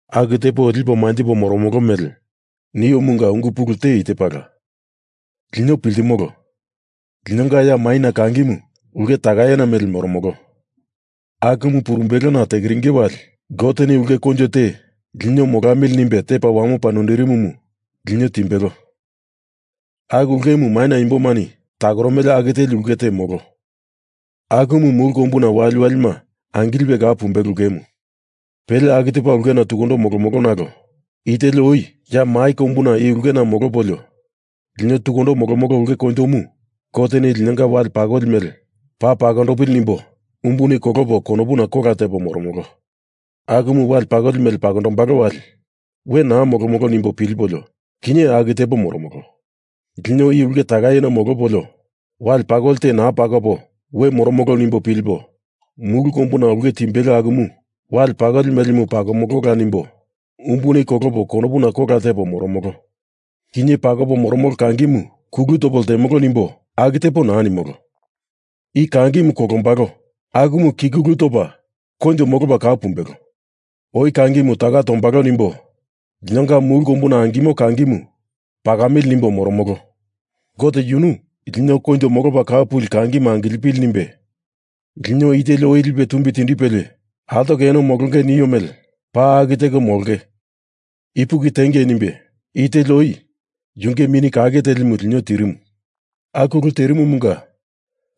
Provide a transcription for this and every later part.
Aku tepo lipo manjipo moromolo mele niomunga ungu pulu te i tepala. Lino piltimolo, linonga ya maina kangimu, ulke takaina mele moromolo. Akumu purumbelona tekiringe wali Goteni ulke koinjo te lino molamili nimbe tepa wamopa noindirimomu lino timbelo, aku ulkemu maina imbomani takoromele aku teli ulke te molo. Akumu mulu kombuna waliwalima angilipe kau pumbelo ulkemu. Pele aku tepa ulkena tukundo molomolo nalo i teli oi ya mai kombuna i ulkena molopolio, lino tukundo molomolo ulke koinjomu Goteni linonga wale pakoli mele paa pakondopili nimbo umbuni kolopo konopuna kola tepo moromolo. Akumu wali pakoli mele pakondombalo wali we naa molomolo nimbo pilipolio, kinye aku tepo moromolo. Lino i ulke takaina molopolio wale pakoli te naa pakopo we moromolo nimbo pilipo mulu kombuna ulke timbelo akumu wale pakoli melemu pakomoloa nimbo umbuni kolopo konopuna kola tepo moromolo. Kinye pakopo moromolo kangimu kulupo topo lteamili nimbo aku tepo naa nimolo. I kangi kolombalo akumu kikulu topa koinjo molopa kau pumbelo. Oi kangimu taka tombalo nimbo linonga mulu kombuna angimo kangimu pakamili nimbo moromolo. Gote yunu lino koinjo molopa kau puli kangima angilipili nimbe lino i teli oi lipe tumbi tindipelie, altoko eno molonge nio mele paa aku teko molonge ipuki tiengei nimbe i teli oi yunge Mini Kake Telimu lino tirimu. Aku ulu terimumunga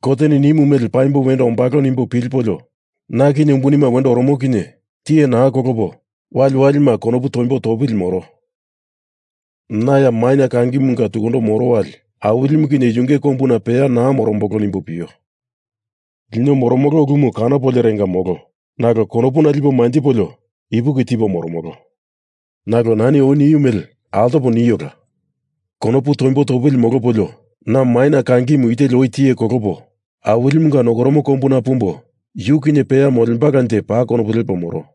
Goteni nimu mele paimbo wendo ombalo nimbo pilipolio na kinye umbunima wendo oromo kinye tiye naa kolopo waliwalima konopu toimbo topili moro. Na ya maina kangimunga tukundo moro wali Awilimu kinye Yunge kombuna peya naa morombolo nimbo pio. Lino moromolo ulumu kanopoliorenga molo, nalo konopuna lipo manjipolio ipuki tipo moromolo. Nalo nani oi nio mele altopo niola. Konopu toimbo topili molopolio na maina kangimu i teli oi tiye kolopo Awilimunga nokoromo kombuna pumbo yu kinye peya molembalanje paa konopu lepo moro.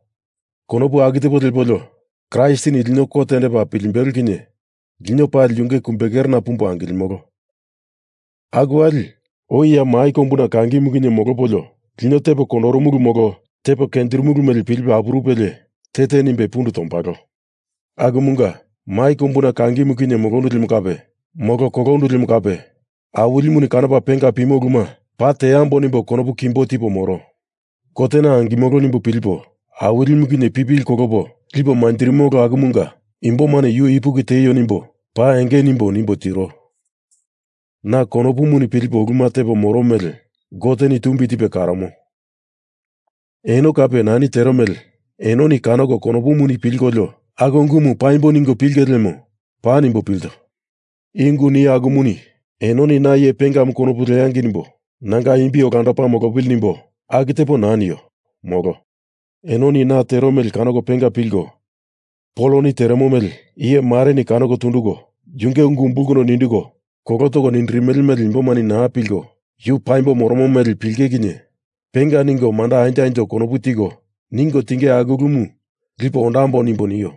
Konopu aku tepo lepolio Kraistini lino kot tendepa pilimbelo kinye lino pali yunge kumbekerena pumbo angilimolo. Aku wali oi ya mai kombuna kangimu kinye molopolio lino tepo kondorumulu molo tepo kenjirimulu mele pilipe apurupelie te te nimbe pundu tombalo. Akumunga, mai kombuna kangimu kinye molondu lemo kape, molo kolondu lemo kape Awilimuni kanopa penga pimo uluma paa teambo nimbo konopu kimbo tipo moro. Kotena angimolo nimbo pilipo Awilimu kinye pipili kolopo lipo manjirimolo akumunga imbomani Yu ipuki tieio nimbo paa enge nimbo nimbo tiro. Na konopuni pilipo uluma tepo moro mele Goteni tumbi tipe karomo. Eno kape nani tero mele enoni kanoko konopuni pilkolio aku ungumu paimbo ningo pilenge lemo paa nimbo pilto. I ungu nio akumuni enoni na iye pengamu konopu leangei nimbo nanga imbi olandopa molopili nimbo aku tepo naa nio, molo. Enoni na tero mele kanoko penga pilko, Poloni teremo mele iye mareni kanoko tunduko yunge ungu umbulkondo kolo toko nindirimele mele imbomani naa pilko, yu paimbo moromo mele pilinge kinye penga ningo manda anjo anjo konopu tiko ningo tinge aulkemu lipo ondambo nimbo nio.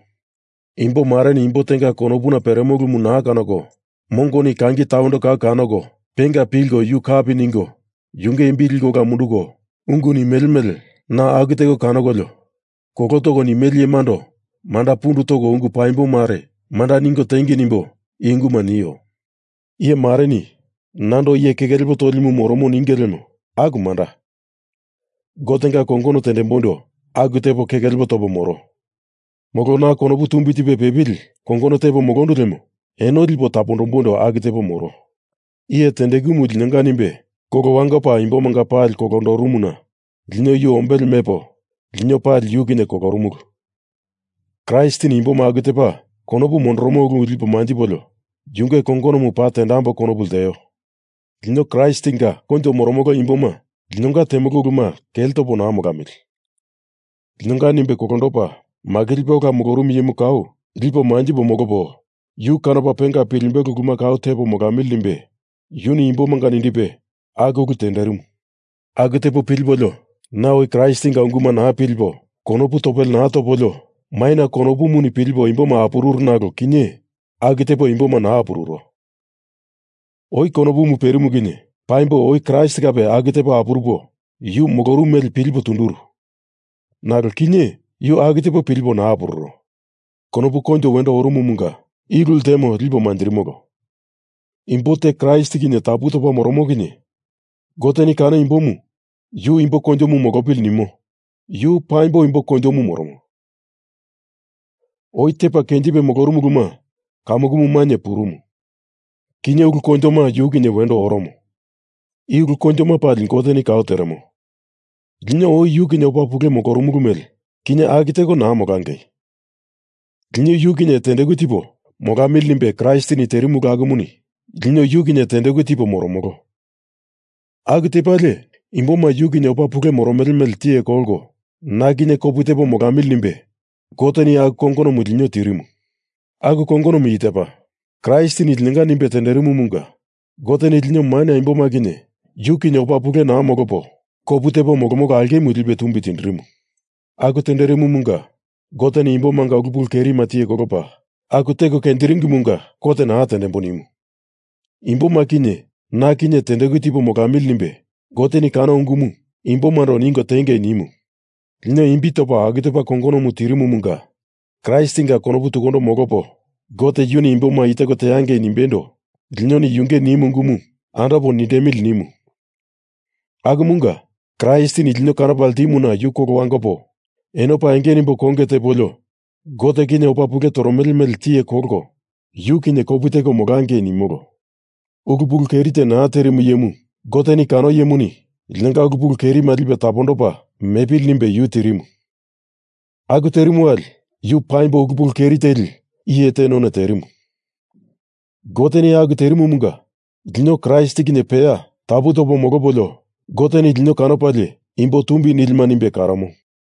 Imbo mareni imbo tenga konopuna peremo ulumu naa kanoko, mongoni kangi tawendo kau kanoko penga pilko yu kapi ningo yunge imbi liko ola munduko ungu nimele mele na aku teko kanokolio kolo toko nimele iyemando manda pundu toko ungu paimbo mare manda ningo tiengei nimbo i unguma nio. Iye mareni nando iye keke lepo tolimu morono ninge lemo aku manda. Gotenga kongono tendemboindo aku tepo keke lepo topo moro. Molo na konopu tumbi tipe pepili kongono tepo molondu lemo eno lipo tapondomboindo aku tepo moro. Iye tendekumu linonga nimbe kolo wangopa imbomanga pali kolondorumuna lino yu ombele mepo lino pali yu kinye kolorumulu. Kraistini imboma aku tepa konopu mondoromo ulu lipo manjipolio yunge kongonomu paa tendambo konopu lteo. Lino Kraistinga koinjo moromolo imboma linonga temolo uluma kele topo naa molamili. Linonga nimbe kolondopa makilipe ola molorumu iyemu kau lipo manjipo molopo yu kanopa penga pilimbelo uluma kau tepo molamili nimbe yuni imbomanga nindipe aku ulu tenderimu. Aku tepo pilipolio na oi Kraistinga unguma naa pilipo konopu topele naa topolio maina konopuni pilipo imboma apururu nalo kinye, aku tepo imboma naa apururo. Oi konopumu perimu kinye paimbo oi Kraist kape aku tepo apurupo, yu molorumu mele pilipo tunduru, nalo kinye yu aku tepo pilipo naa apururo. Konopu koinjo wendo orumumunga, i ulu ltemo lipo manjirimolo. Imbo te Kraist kinye tapu topa moromo kinye Goteni kano imbomu yu imbo koinjomu molopili nimo, yu paimbo imbo koinjomu moromo. Oi tepa kenjipe molorumu uluma kamukumu mainye purumu. Kinye ulu koinjoma yu kinye wendo oromo. I ulu koinjoma pali Goteni kau teremo. Lino oi yu kinye opa pule molorumulu mele kinye aku teko naa molangei. Lino yu kinye tendeku tipo molamili nimbe Kraistini terimu ulu akumuni lino yu kinye tendeku tipo moromolo. Aku tepalie imboma yu kinye opa pule moromele mele tiye kolko na kinye kopu tepo molamili nimbe Goteni aku kongonomu lino tirimu. Aku kongonomu i tepa: Kraistini linonga nimbe tenderimumunga Goteni lino maina imboma kinye yu kinye opa pule naa molopo kopu tepo molomolo aulkemu lipe tumbi tindirimu. Aku tenderimumunga Goteni imbomanga ulu pulu kerima tiye kolopa, aku teko kenjiringimunga kot naa tendembo nimu. Imboma kinye na kinye tendeku tipo molamili nimbe Goteni kano ungumu imbomando ningo tiengei nimu. Lino imbi topa aku tepa kongonomu tirimumunga Kraistinga konopu tukundo molopo Gote yuni imboma i teko teangei nimbeindo linoni yunge nimu ungumu andopo nindemili nimu. Akumunga Kraistini lino kanopa ltimuna yu kolo wangopo eno paa enge nimbo konge tepolio Gote kinye opa pule toromele mele tiye kolko yu kinye kopu teko molangei nimolo. Ulu pulu keri te naa terimu iyemu Goteni kano iyemuni linonga ulu pulu kerima lipe tapondopa mepili nimbe yu tirimu. Aku terimu wali yu paimbo ulu pulu keri teli iye te none terimu. Goteni aku terimumunga lino Kraist kinye peya tapu topo molopolio Goteni lino kanopalie imbo tumbi nilima nimbe karomo.